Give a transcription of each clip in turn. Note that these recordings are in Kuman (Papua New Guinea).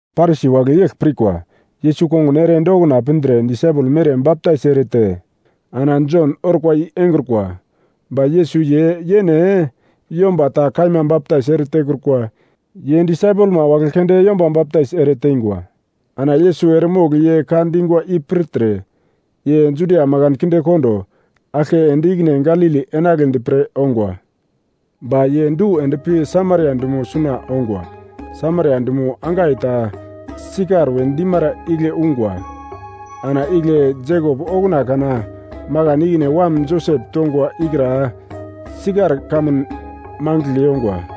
Parisi wagle yegl pirkwa: Yesus kongun ere ende okuna pindre disaipel mere baptais erete ana Jon orkwa i engrukwa. Ba Yesus ye yene yomba ta kaima baptais ere tekrukwa, ye disaipelma wagle keunde yomba baptais ere teingwa. Ana Yesus eremogl ye ka dingwa i pirtre, ye Judia makan kindekondo aglke ende ikine Galili enagledi pre ongwa. Ba ye du ende pi Samaria dumo suna ongwa, Samaria dumo angai ta Sikar we dimara igle ungwa. Ana igle Jekop okuna kana makan ikine wam Josep tongwa ikra Sikar kamun mangigl yongwa.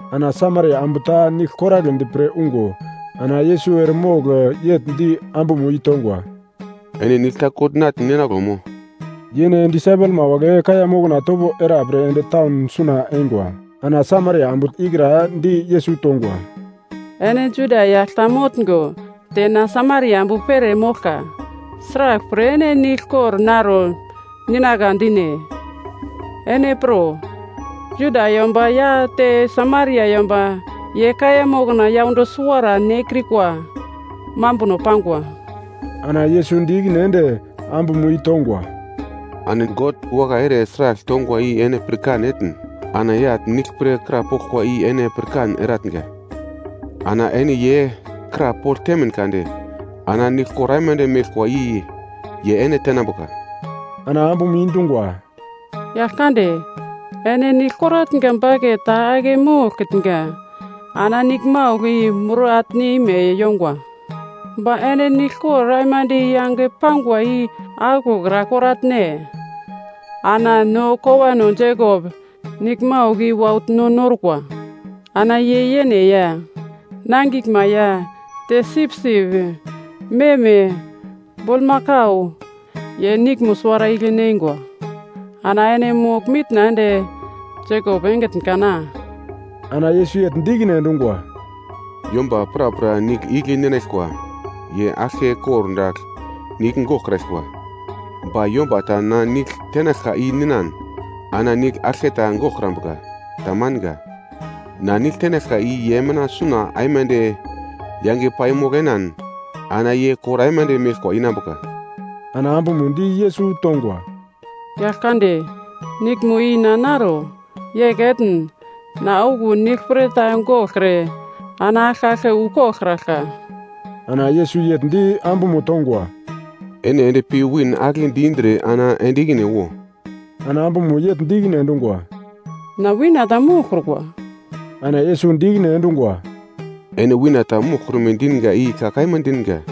Ana Samaria ambu ta nigl koragledi pre ungo, ana Yesus eremogl yegl di ambumo i tongwa, “Ene nigl ta kogl natn ninaglo mo?” (Yene disaipelma wagle kaiya mokna topo era pre ende taun suna eingwa.) Ana Samaria ambu ikra di Yesus tongwa, “Ene Juda yagl ta motngo te na Samaria ambu pere moglka. Sraglpre ene nigl kogl naro ninagla dine? Ene pro, Juda yomba ya te Samaria yomba ye kaiya mokna yaundo suwara nekrikwa mambuno pangwa.” Ana Yesus di ikine ende ambumo i tongwa, “Ana God wakai ere sragl tongwa i ene pirkan etn, ana yagl nigl pre krapoglkwa i ene pirkan eratnga, ana ene ye krapogl temin kade, ana nigl kor aimande meglkwa i ye ene tenambuka.” Ana ambumo i dungwa, “Yagl kande, ene nigl koratnga baket ta ake moglkitnga, ana niglmaugl i mur atne ime yongwa. Ba ene niglkor aimande yange pangwa i aglokra koratne? Ana no kowano Jekop niglmaugl i waugl no norkwa, ana ye yene ya, nangiglma ya, te sipsip, meme, bulmakau, ye niglmo suwara igle neingwa. Ana ene mogl-mitna ende Jekop engitn kana?” Ana Yesus yegl di ikine endungwa, “Yomba prapra nigl igle ninaglkwa, ye aglke kordagl nigl goraglkwa. Ba yomba ta na nigl tenaglka i ninan ana nigl aglketa goglkrambuka. Tamanga. Na nigl tenaglka i ye mina suna aimande yange paimogl enan ana ye kor aimande meglkwa inambuka.” Ana ambumo di Yesus tongwa, “Yagl kande, niglmo i na naro. Yegl etn na okuwo nigl pre ta goglkre ana aglke aglke wu koglkraglka.” Ana Yesus yegl di ambumo tongwa, “Ene ende pi win agle di-indre ana ende ikine wo.” Ana ambumo yegl di ikine endungwa, “Na wina ta moglkrukwa.” Ana Yesus di ikine endungwa, “Ene wina ta moglkrume dinga i ka kaima dinga.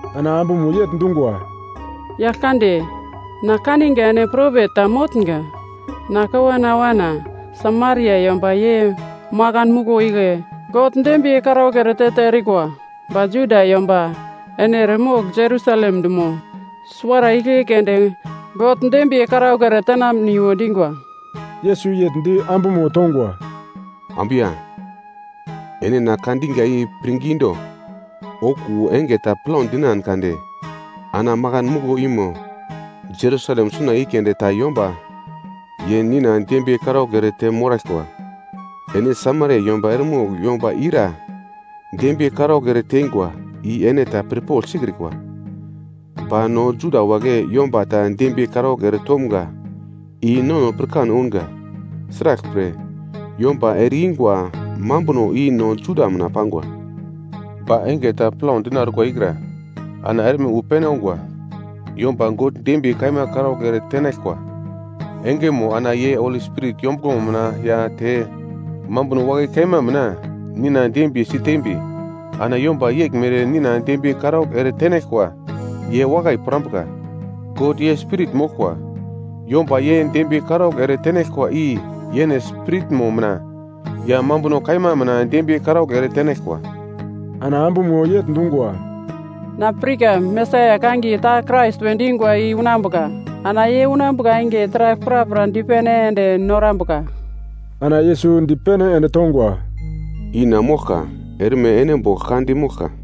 Ana ambumo yegl dungwa, “Yagl kande, na kaninga ene propet ta motnga. Na kowana awana Samaria yomba ye makan muglo igle God dembiye karaugl ere te-te erikwa, ba Juda yomba ene eremogl Jerusalem dumo suwara igle keunde God dembiye karaugl ere tenamniwo dingwa.” Yesus yegl di ambumo tongwa, “Ambu ya, ene na ka dinga i pirngi do, okuwo enge ta plau dinan kade ana makan muglo i mo Jerusalem suna i keunde ta yomba ye nina dembiye karaugl ere te moglkraglkwa. Ene Samaria yomba eremogl yomba ira dembiye karaugl ere teingwa i ene ta pirpogl sikrikwa. Ba no Juda wagle yomba ta dembiye karaugl ere tomga i no nono pirkan ounga. Sraglpre, yomba ere-ingwa mambuno i no Juda mina pangwa. Ba enge ta plau dina orkwa ikra, ana erme wu pene ongwa. Yomba God dembiye kaima karaugl ere tenaglkwa engemo, ana ye Holi Spirit yombuglomo mina ya te mambuno wakai kaima mina nina dembiye sitembi, ana yomba yeglmere nina dembiye karaugl ere tenaglkwa, ye wakai pirambuka. God ye Spirit moglkwa, yomba ye dembiye karaugl ere tenaglkwa i yene spiritmo mina ya mambuno kaima mina dembiye karaugl ere tenaglkwa.” Ana ambumo yegl dungwa, “Na pirka Mesaia kangiye ta Krais we dingwa i unambuka, ana ye unambuka enge taragl prapra dipene ende norambuka.” Ana Yesus dipene ende tongwa, “I na moglka, erme ene bogl ka dimoglkwa.”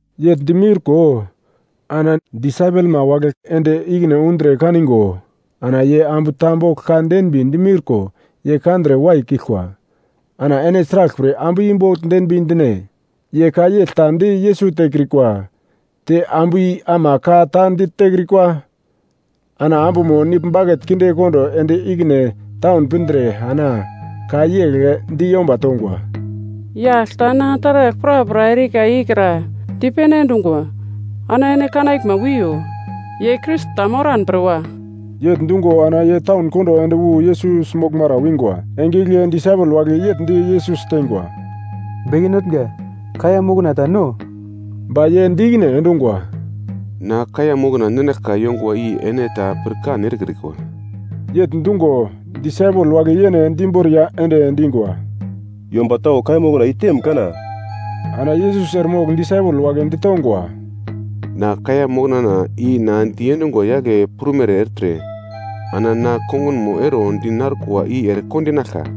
Yegl dimiurko, ana disaipelma wagle ende ikine undre kaningo, ana ye ambu ta bogl ka denbi dimiurko ye kandre waikiglkwa. Ana ene sraglpre ambu i bogl denbi dine? Ye ka yegl ta di Yesus tekrikwa, te ambuno i ama ka ta ditekrikwa. Ana ambumo nigl baket kindekondo ende ikine taun pindre ana ka yegl di yomba tongwa, “Yagl ta na taragl prapra erika ikra dipene endungwa, ana ene kanaglma wiyo. Ye Krais ta moran pre wa?” Yegl dungo ana ye taun kondo ende wu Yesus moglmara wingwa. Enge igle disaipel wagle yegl di Yesus teingwa, “Beke Notnga, kaiya mokna ta no.” Ba ye di ikine endungwa, “Na kaiya mokna ninaglka yongwa i ene ta pirkan erekrikwa.” Yegl dungo, disaipel wagle yene di imboriya ende dingwa, “Yomba tau kaiya moknamo iteim kana?” Ana Yesus eremogl disaipel wagle ditongwa, “Na kaiya moknana, i na diendungwa yagle prumere ertre, ana na kongunmo ero di narkwa i ere kondinaglka.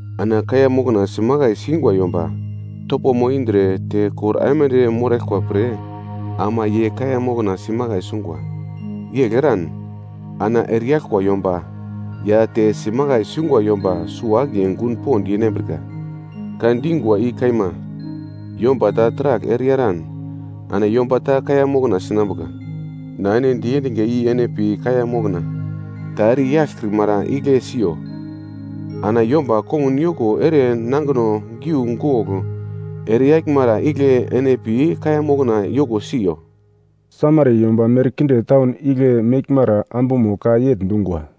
Ana kaiya mokna simakai singwa yomba topomo indre, te kor aimande moraglkwa pre ama ye kaiya mokna simakai sungwa. Yegl eran ana ereyaglkwa yomba ya te simakai sungwa yomba suwo-akiye gun pond yenambrika. Ka dingwa i kaima, yomba ta taragl ereyaran ana yomba ta kaiya mokna sinambuka. Na ene diendinga i ene pi kaiya mokna ta ere yaglkrimara igle siyo, ana yomba kongun yoko ere nangino giugogl ere yaglmara igle ene pi kaiya mokna yoko siyo.” Samaria yomba merkinde taun igle meglmara ambumo ka yegl dungwa,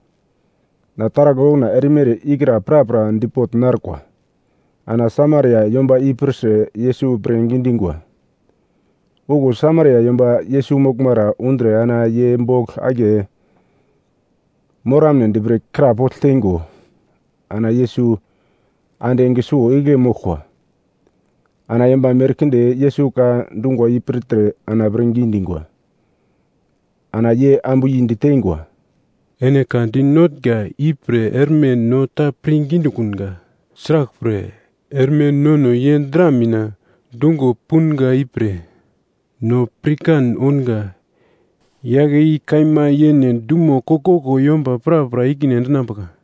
“Na taragl okuna erimere ikra prapra dipogl narkwa.” Ana Samaria yomba i pirtre Yesus pirngi dingwa. Okuwo Samaria yomba Yesus moglmara undre ana ye bogl akiye moramnedi krapogl teingo, ana Yesus ande enge suwo igle moglkwa. Ana yomba merkinde Yesus ka dungwa i pirtre ana pirngi dingwa. Ana ye ambu i diteingwa, “Ene ka dinotnga i pre erme no ta pirngi dikunga, sraglpre erme nono ye dra mina dungo punga i pre, no pirkan ounga. Yagle i kaima yene dumo koglkoglo yomba prapra ikine endinambuka.”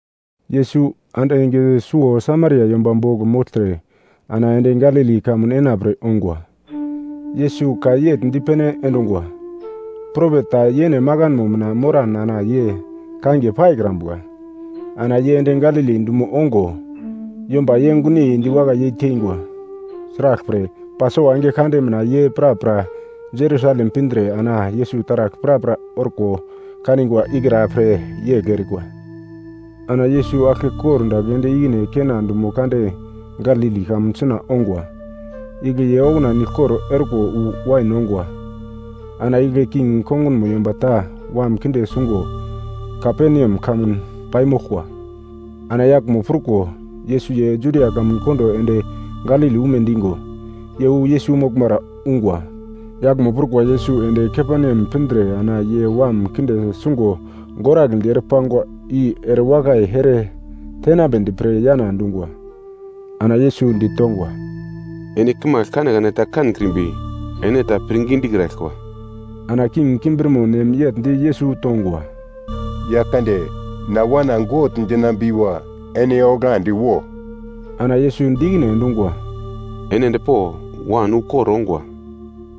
Yesus ande enge suwo Samaria yomba bogl mogltre ana ende Galili kamun enapre ongwa. Yesus ka yegl dipene endungwa, “Propet ta yene makanmo mina moran ana ye kangiye paikrambuka.” Ana ye ende Galili dumo ongo, yomba ye gunyei diwakai yei teingwa, sraglpre, Pasova enge kande mina ye prapra Jerusalem pindre ana Yesus taragl prapra orko kanigwa ikra pre yegl erikwa. Ana Yesus aglke kordagl ende ikine Kena dumo kande Galili kamun suna ongwa. Igle ye okuna niglkor orko wu wain ongwa. Ana igle king kongunmo yomba ta wam kinde sungo Kaperneam kamun paimoglkwa. Ana yaglmo pruko, Yesus ye Judia kamun kondo ende Galili ume dingo, ye wu Yesus moglmara ungwa. Yaglmo prukwa Yesus ende Kaperneam pindre ana ye wam kinde sungo gorambedi ere pangwa i erewakai ere tenambedi pre yana dungwa. Ana Yesus ditongwa, “Ene kimagl kanekane ta kankrimbi, ene ta pirngi dikraglkwa.” Ana king kimbirmonem yegl di Yesus tongwa, “Yagl kande, na wana gogl dinambiwo ene onglandi wo.” Ana Yesus di ikine endungwa, “Ene ende po, wan ukor ongwa.”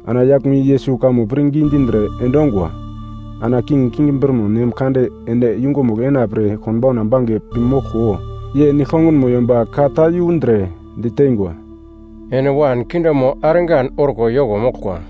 Ana yaglmo i Yesus kamo pirngi dindre endongwa. Ana king kimbirmonem kande ende yungumugl ena pre konbauna bange pi moglko, ye nigl-kongunmo yomba ka ta yundre diteingwa, “Ene wan kindemo argan orko yoko moglkwa.”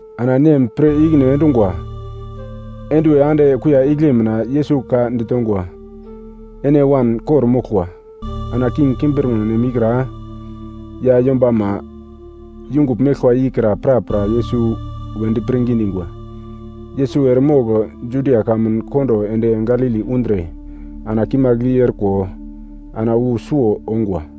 Ana nem pir ikine endungwa, enduwe ande kuiya igle mina Yesus ka ditongwa, “Ene wan kor-moglkwa.” Ana king kimbirmonem ikra, ya yombama yungugl meglkwa i kra prapra Yesus wedi pirngi dingwa. Yesus eremogl Judia kamun kondo ende Galili undre ana kimagl i orko, ana wu suwo ongwa.